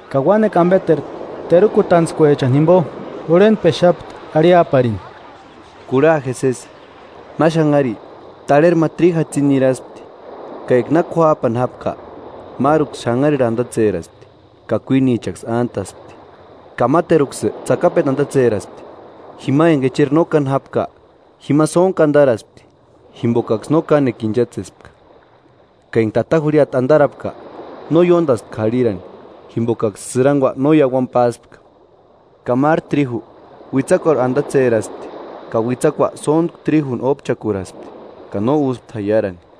Ka uánekua ambeteru terukutantskuechani Uandantskua terukutarantskua jinguni. jimbo jurhentpexapti arhiaparini: “Kurha je sési: Ma xanhari tarheri ma tríju jatsini niraspti, ka eka na k'uájpani jápka, máruksï xanharirhu andatseraspti, ka kuínichaksï ántaspti. Ka máteruksï tsakapendu andatseraspti, jima enga echeri no káni jápka; jima sóntku andaraspti, jimbokaksï no kánekua inchatsespka, ka enga tata jurhiata andarapka, no ióndaspti k'arhiraani, jimbokaksï sïrangua no iauani páspka. Ka máru tríju, uitsakuarhu andatseraspti, ka uitsakua sóntku tríjuni ópchakuraspti ka no úspti jaiarani.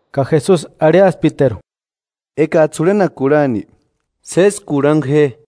Ka Jesusi arhiasptiteru: “Ekajtsï jurhenaka kurhani, sési kurhangu je.”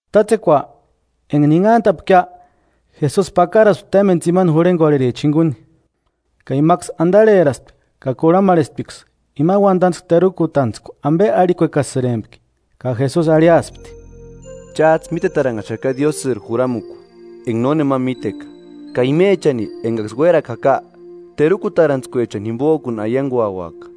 Tátsekua, enga ninhantapkia, Jesusi pakaraspti témbeni tsimani jurhengorhericha jinguni, ka imaksï andarheraspti ka kurhamarhesptiksï, ima uandantskua terukutantskua ambe arhikuekasïrempki. Ka Jesusi arhiaspti: “Chájtsï mítetaranhaxaka Diósïri juramukua, enga nónema míteka, ka imechani engaksï uérakua jaka, terukutarantskuechani jimbojkuni aianguauaka.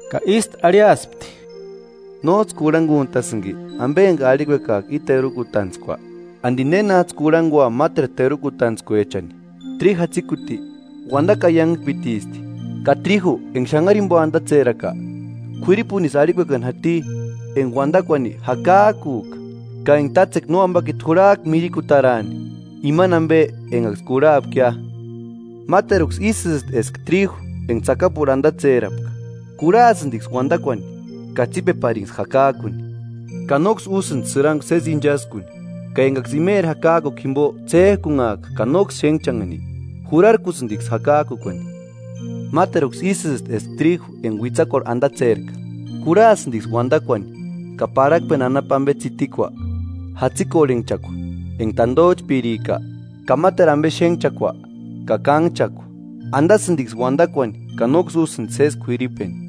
Ka ístu arhiaspti: “¿Nójtsï kurhanguntasïnki ambe enga arhikuekajka i terukutantskua? ¿Andi nénajtsï kurhangua máteru terukutantskuechani? Tríju jatsikuti, uandakua aiangpitisti. Ka tríju enga xanhari jimbo andatseraka, k'uiripunisï arhikuekani jati enga uandakuani jakajkujka, ka enga tátsekua Nóambakiti jurhajka mirikutaraani imani ambe engaksï kurhapkia. Máteruksï ísïsti eska tríju enga tsakapurhu andatserapka: Kurhasïndiksï uandakuani, ka tsípepariniksï jakajkuni, ka nóksï úsïndi sïrangua sési inchaskuni; ka engaksï imeri jakajkukua jimbo ts'éjkunhajka ka nóksï xénhchanhani, jurarkusïndiksï jakajkukuani. Máteruksï ísïsti eska tríju enga uitsakuarhu andatserka: Kurhasïndiksï uandakuani ka parhakpeni anapu ambe tsitikua, jatsikorhenhchakua enga tandojchpírika, ka máteru ambe xénhchakua, ka kánhchakua, andasïndiksï uandakuani ka nóksï úsïndi sési k'uiripeni.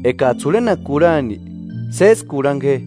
Ekajtsï jurhenaka kurhani, sési kurhangu je.”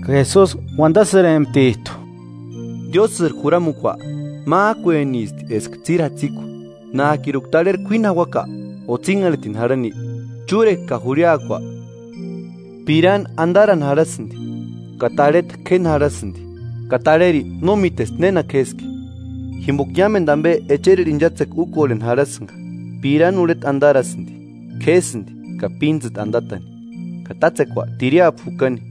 Ka Jesusi uandasïremptijtu: “Diósïri juramukua májkuenisti eska tsíri jatsikua: Nájkiruka tarheri k'uíni jauaka o tsínharhitini jarhani, chúrekua ka jurhiakua pirani andarani jarhasïndi ka tarheta k'éni jarhasïndi, ka tarheri no mítesti néna k'éski. Jimboka iámendu ambe echerirhu inchatsetini úkorheni jarahasïnga: Pirani urheta andarasïndi, k'ésïndi ka píntsïta andatani, ka tátsekua tiriapu jukani.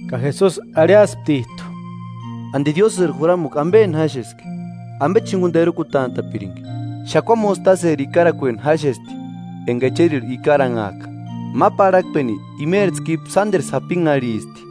Ka Jesusi arhiasptijtu: “¿Andi Diósïri juramukua ambeni jáxeski? ¿Ambechi jinguni terukutantapirinki? Xakua mostaseri ikarakueni jáxesti enga echerirhu ikaranhajka. Ma parhakpeni imeri tskípu sánderu sapinharhisti.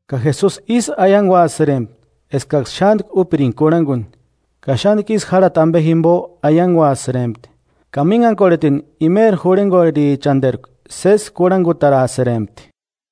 Ka Jesusi ísï aianguasïrempti, eskaksï xántku úpiringa kurhanguni. Ka xántku isï járhati ambe jimbo aiangpesïrempti, ka mínhakorhetini imeri jurhengorherichanderku sési kurhangutarasïrempti.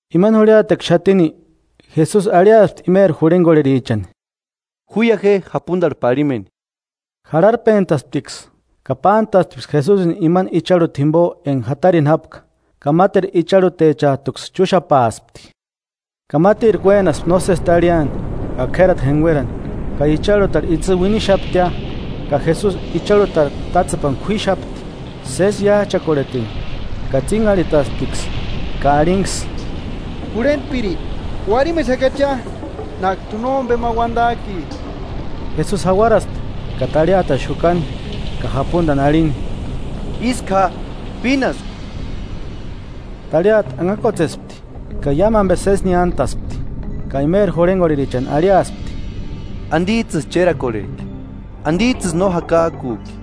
Imani jurhiatekua xatini, Jesusi arhiaspti imeri jurhengorherichani: –Juia je japundarhu parhimeni. Jarharpentasptiksï, ka pántasptisksï Jesusini imani icharhuta jimbo enga jatarini jápka, ka máteru icharhutechajtuksï chúxapaaspti, Ka mátirku uénaspti nósesi tarhiani, ka k'érati jenguerani, ka icharhutarhu itsï uinixaptia. Ka Jesusi icharhutarhu tátsepani k'uíxapti, sési iájchakorhetini, ka tsínharhitasptiksï ka arhinksï: –¡Jurhentpiri, uarhimexakachia! ¿Nájkiri t'u nómbema uandajki? Jesusi jauaraspti ka tarhiatani xukani, ka japundani arhini: –¡Ísku ja! ¡Pínasku! Tarhiata anhakuatsespti, ka iámu ambe sési niántaspti. Ka imeri jurhengorherichani arhiaspti: –¿Andijtsïsï chérakorhejki? ¿Andijtsïsï no jakajkujki?